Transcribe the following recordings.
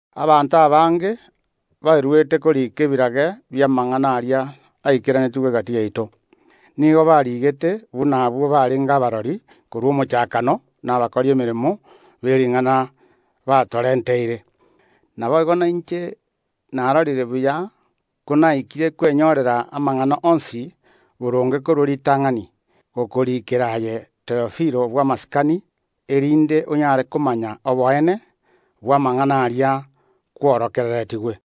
Abanto abange beruete koriika ebirage bi’amang’ana aria aikeranetigwe egati yaito. Nigo barigete buna intwe twatebetigwe nabwo barenge abarori korwa omochakano na abakori emeremo be ring’ana batorenteire. Naboigo nainche narorire buya, magega konatukire amang’ana onsi boronge korwa ritang’ani, gokoriikera aye Theofilo bw’amasikani, erinde onyare komanya oboene bw’amang’ana aria kwegeretigwe.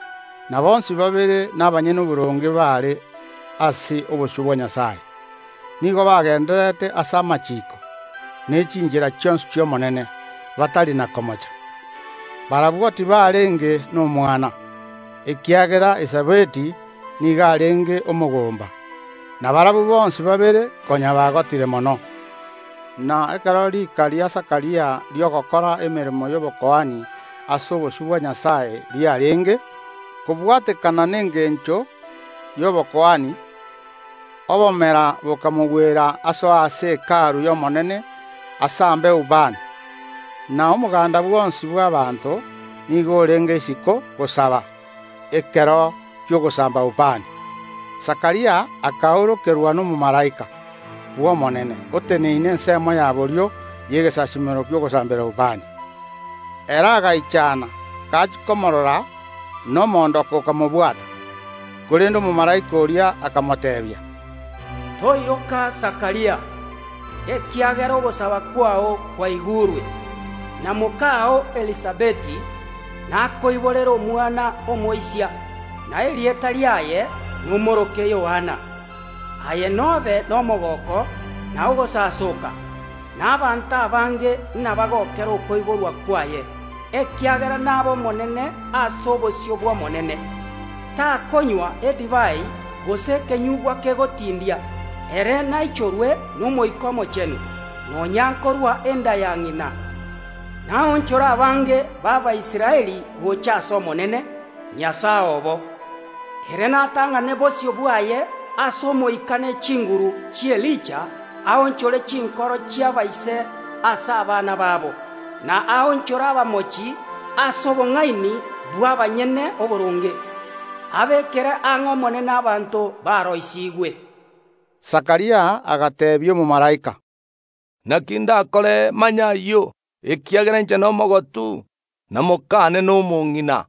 Na bonsi babere nigo barenge abanyene oboronge ase obosio bwa Nyasae; nigo babwatetie amachiiko ne chinchera chionsi chi’Omonene batari na komocha. Barabwo tibarenge nomwana, ekiagera Elisabeti nigo arenge omogomba, na barabwo bonsi babere konya bagotire mono. Na ekero riika ria Zakaria ri’ogokora emeremo y’obokuani ase obosio bwa Nyasae riarenge, kobwatekana nengencho y’obokuani, obomera bokamogwera asoe ase Hekalu y’Omonene asambe ubani. Na omoganda bwonsi bw’abaanto nigo orenge isiko gosaba ekero ki’ogosamba ubani. Zakaria akaorokerwa nomomalaika bw’Omonene, oteneine ensemo ya borio y’egesasiimero ki’ogosambera ubani. Ere agaichana gachia komorora, na omoondoko okamobwata. Korende omomalaika oria akamoteebia, Toiroka, Zakaria, ekiagera ogosaba kwao kwaigurwe, na mokao Elisabeti nakoiborere omwana omoisia, na erieta riaye nomoroke Yohana. Aye nobe nomogooko na ogosasooka, na abanto abange nabagokere okoiborwa kwaye, ekiagera nabe omonene ase obosio bw’Omonene. Takonywa edivai gose ekenyugwa kegotindia; ere naichorwe n’Omoika Omochenu, nonya nkorwa enda ya ng’ina. Naonchore abange b’Abaisraeli gocha ase Omonene, Nyasae obo. Ere natang’ane bosio bwaye ase omoika ne chinguru chi’Elija, aonchore chinkoro chi’abaise ase abana baabo, na aonchore abamochi ase obong’aini bw’abanyene oboronge, abeekere ang’e Omonene abanto baroisiigwe. Zakaria agateebia omomalaika, “Naki ndakore imanye ayio? Ekiagera inche nomogotu, na mokane nagendererete kogota.”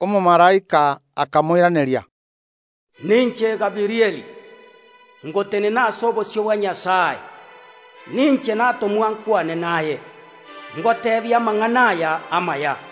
Omomalaika akamoiraneria, “Ninche Gabirieli, ngotenena ase obosio bwa Nyasae; ninche natomwa nkwane naye, ngoteebie amang’ana aya amaya.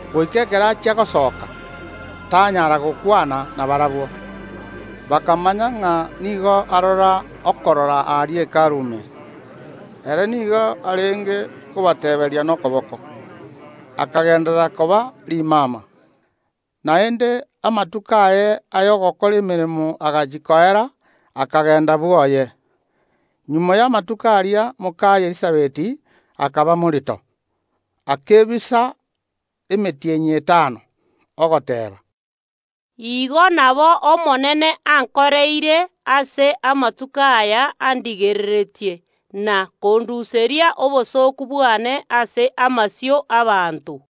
Ekero asogete isiko, tanyarete gokwana nabarabwo; erio barabwo bakamanya ng’a nigo arora okorora aria Hekalu ime. Ere nigo arenge kobateeberia nokoboko, akagenderera koba rimama. Ekero amatuko aye y’ogokora emeremo aerete, ere akagenda bwoye. Magega y’amatuko aria mokaye Elisabeti akaba morito, akebisa emetienyi etano, ogoteeba, “Igo nabo Omonene ankoreire ase amatuko aya andigereretie, na konduseria obosooku bwane ase amasio y’abanto.”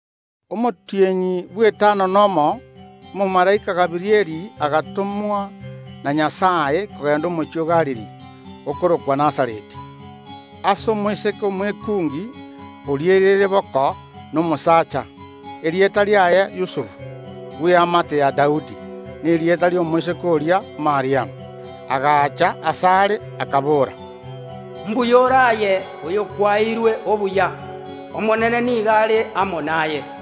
Omotienyi bw’etano nomo omomalaika Gabirieli agatomwa na Nyasae kogenda omochie o Galili, okorokwa Nazareti, ase omoiseke omwekungi oriereire boko nomosaacha, erieta riaye Yusufu, bw’eamate ya Daudi, na erieta ri’omoiseke oria Mariamu. Agacha asare, akabora, “Mbuya ore aye, oyobwanchererie. Omonene nigo are amo naye.”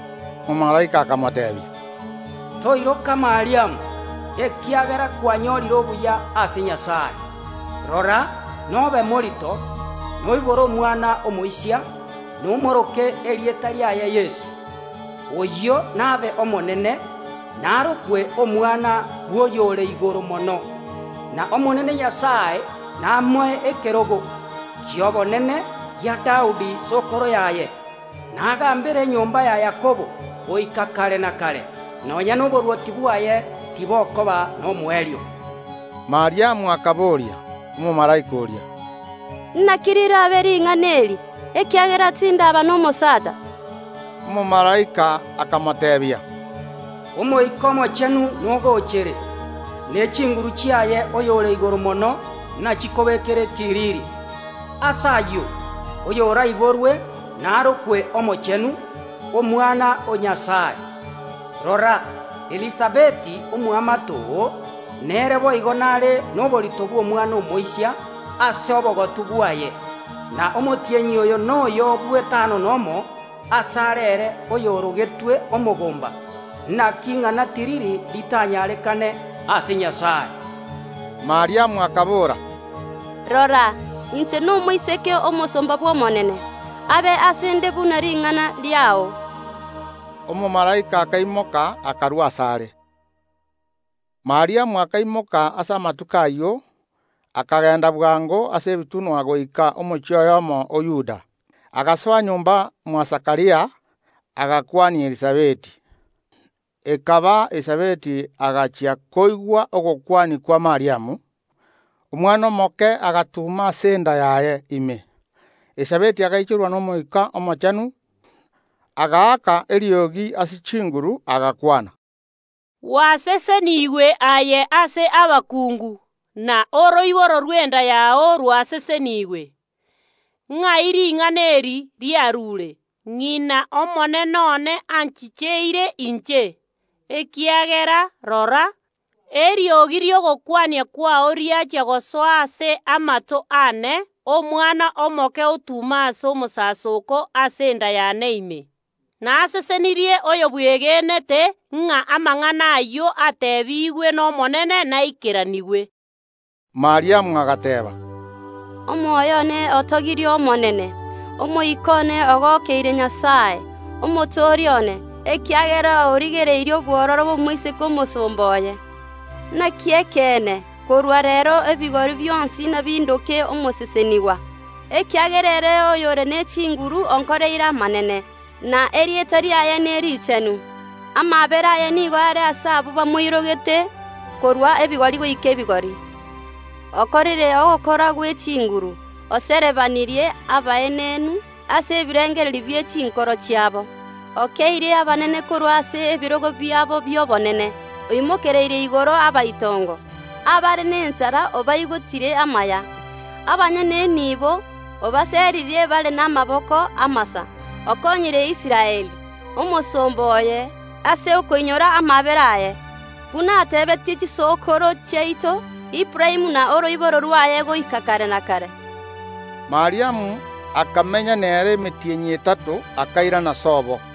Omomalaika akamoteebia, Toiroka Mariamu, ekiagera kwanyorire ogwancherwa ase Nyasae. Rora, nobe morito, noibore omwana omoisia, nomoroke erieta riaye Yeso. Oyio nabe omonene, narokwe Omwana o Nyasae ore Igoro Mono; n’Omonene namoe ekerogo ki’obonene gia Daudi sokoro yaye; nagaambere enyomba ya Yakobo goika kare na kare; nonya noborwoti bwaye tibokoba nomoerio. Mariamu akabooria omomalaika oria, “Naki rirabe ring’ana eri, ekiagera tindaba nomosaacha?” Omomalaika akamoteebia, “Omoika Omochenu nogochere, ne chinguru chiaye Oyore Igoro Mono nachikobekere ekiriri. Ase ayio, oyoraiborwe narokwe Omochenu, Omwana o Nyasae. Rora, Elisabeti omoamate oo, nere boigo nare noborito bw’omwana omoisia ase obogotu bwaye; na omotienyi oyo noyo bw’etano nomo asare ere oyorogetwe omogomba. Naki ing’ana tiriri ritanyarekane ase Nyasae.” Mariamu akabora, “Rora, inche nomosomba bw’Omonene; abe ase ’nde buna ring’ana riao.” Omomalaika akaimoka akarua asare. Mariamu akaimoka ase amatuko ayio, akagenda bwango ase ebitunwa goika omochie oyomo o Yuda, agasoa nyomba mwa Zakaria, agakwania Elisabeti. Ekaba Elisabeti agachia koigwa ogokwania kwa Mariamu, omwana omoke agatuma ase enda yaye ime; Elisabeti agaichorwa n’Omoika Omochenu, agaaka eriogi ase chinguru, agakwana, “Gwaseseniigwe aye ase abakungu, na oroiboro rw’enda yao rwasesenigwe. Ng’ai ring’ana eri riarure, ng’ina Omonene one anchicheire inche? Ekiagera rora, eriogi ri’ogokwania kwao riachia gosoa ase amato aane, omwana omoke otuma ase omosasoko ase enda yane ime. Nasesenirie oyobwegenete ng’a amang’ana ayio ateebigwe n’Omonene naikeranigwe.” Mariamu agateeba, “Omoyo one otogirie Omonene, omoika one ogokeire Nyasae, Omotoria one, ekiagera origereirie obwororo bw’omoiseke omosomba oye. Naki ekeene, korwa reero ebigori bionsi nabindoke omosesenigwa, ekiagera ere oyore ne chinguru onkoreire amanene, na erieta riaye nerichenu. Amaabera aye nigo are ase abwo bamoirogete korwa ebigori goika ebigori. Okorire ogokora gwe chinguru, oserebanirie abaenenu ase ebirengererio bie chinkoro chiabo. Okeeirie abanene korwa ase ebirogo biabo bi’obonene, oimokereirie igoro abaitongo. Abare nenchara obaigotirie amaya; abanyene enibo obaseririe bare namaboko amasa. Okonyire Israeli, omosomba oye, ase okoinyora amaabera aye, buna atebeetie chisokoro chiaito, Aburaamu na oroiboro rwaye, goika kare na kare.” Mariamu akamenya nere emetienyi etato, akairana sobo.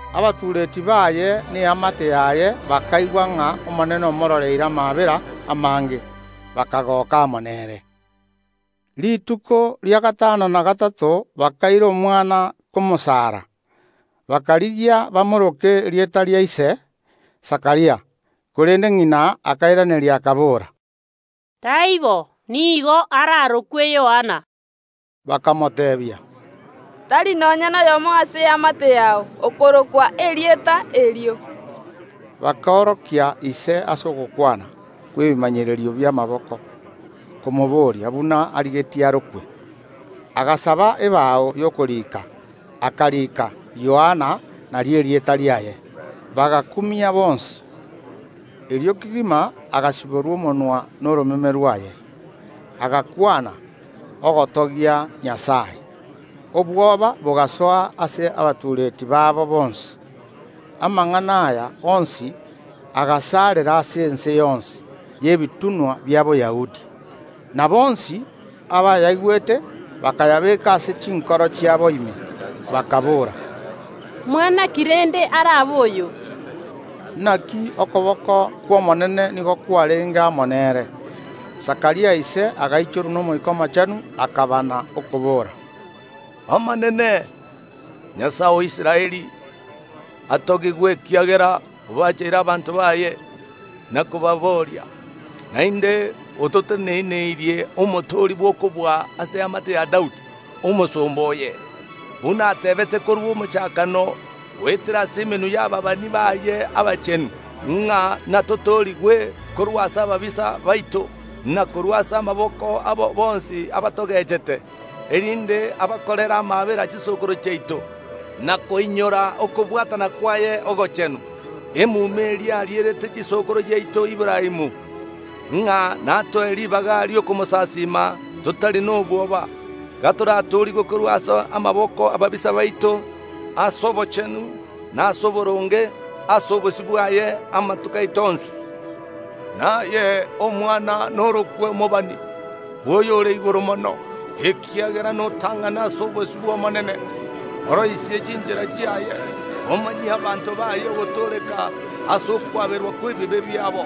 Abairi na eamate yaye bakaigwa ng’a Omonene omororeire amaabera amange, bakagoka amo nere. Rituko ria gatano na gatato bakaira omwana komwarokia, bakarigia bamoroke erieta ria ise, Zakaria, korende ng’ina akairaneria, akabora, “Taibo; nigo ararokwe Yohana.” Bakamoteebia, “Tari nonya noyomo ase eamate yao okorokwa erieta erio.” Bakorokia ise ase ogokwana kw’ebimanyererio bi’amaboko, komoboria buna arigetie arokwe. Agasaba ebao y’okorika, akarika “Yohana, nario erieta riaye.” Bagakumia bonsi. Erio kegima agasiborwa omonwa na oromeme rwaye, agakwana, ogotogia Nyasae. Obwoba bogasoa ase abairi babo bonsi. Amang’ana aya onsi agasaarera ase ense yonsi y’ebitunwa bia Boyahudi. Na bonsi abayaigwete bakayabeeka ase chinkoro chiabo ime, bakaboora, “Mwana ki rende arabe oyo?” Naki okoboko kw’Omonene nigo kwarenge amo nere. Zakaria ise agaichorwa n’Omoika Omochenu, akabana, okobora, “Omonene, Nyasae o Israeli, atogigwe, ekiagera obacheire abanto baye na kobabooria. Naende ototeneneirie Omotooria bw’okobua ase eamate ya Daudi, omosomba oye. Buna ateebete korwa omochakano goetera ase emenwa y’ababani baye abachenu, ng’a natotoorigwe korwa ase ababisa baito, na korwa ase amaboko abo bonsi abatogechete, erinde abarorere amaabera chisokoro chiaito, na koinyora okobwatana kwaye ogochenu. Emuma eria arierete sokoro yaito Aburaamu, ng’a natoe ribaga ri’okomosasiima totari nobwoba, gatoratoorigwe korwa ase amaboko y’ababisa baito, ase obochenu na ase oboronge ase obosio bwaye amatuko aito onsi. Naye, Omwana, norokwe omobani bw’Oyore Igoro Mono, ekiagera notang’ane ase obosio bw’Omonene. Oroisie chinchera chiaye, omanyie abanto baye ogotooreka ase okwaberwa kw’ebibe biabo.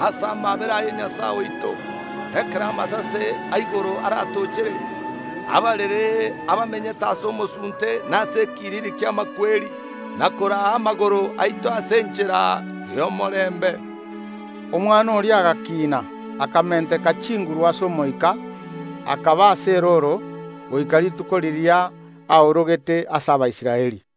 Ase amaabera aye Nyasae oito, ekero amasase a igoro aratochere, ababerere abamenyete ase omosunte na ase ekiriri ki’amakweri, na koraa amagoro aito ase enchera y’omorembe.” Omwana oria agakiina, akamenteka chinguru ase omoika, akaba ase erooro goika rituko riria aorogete ase Abaisraeli.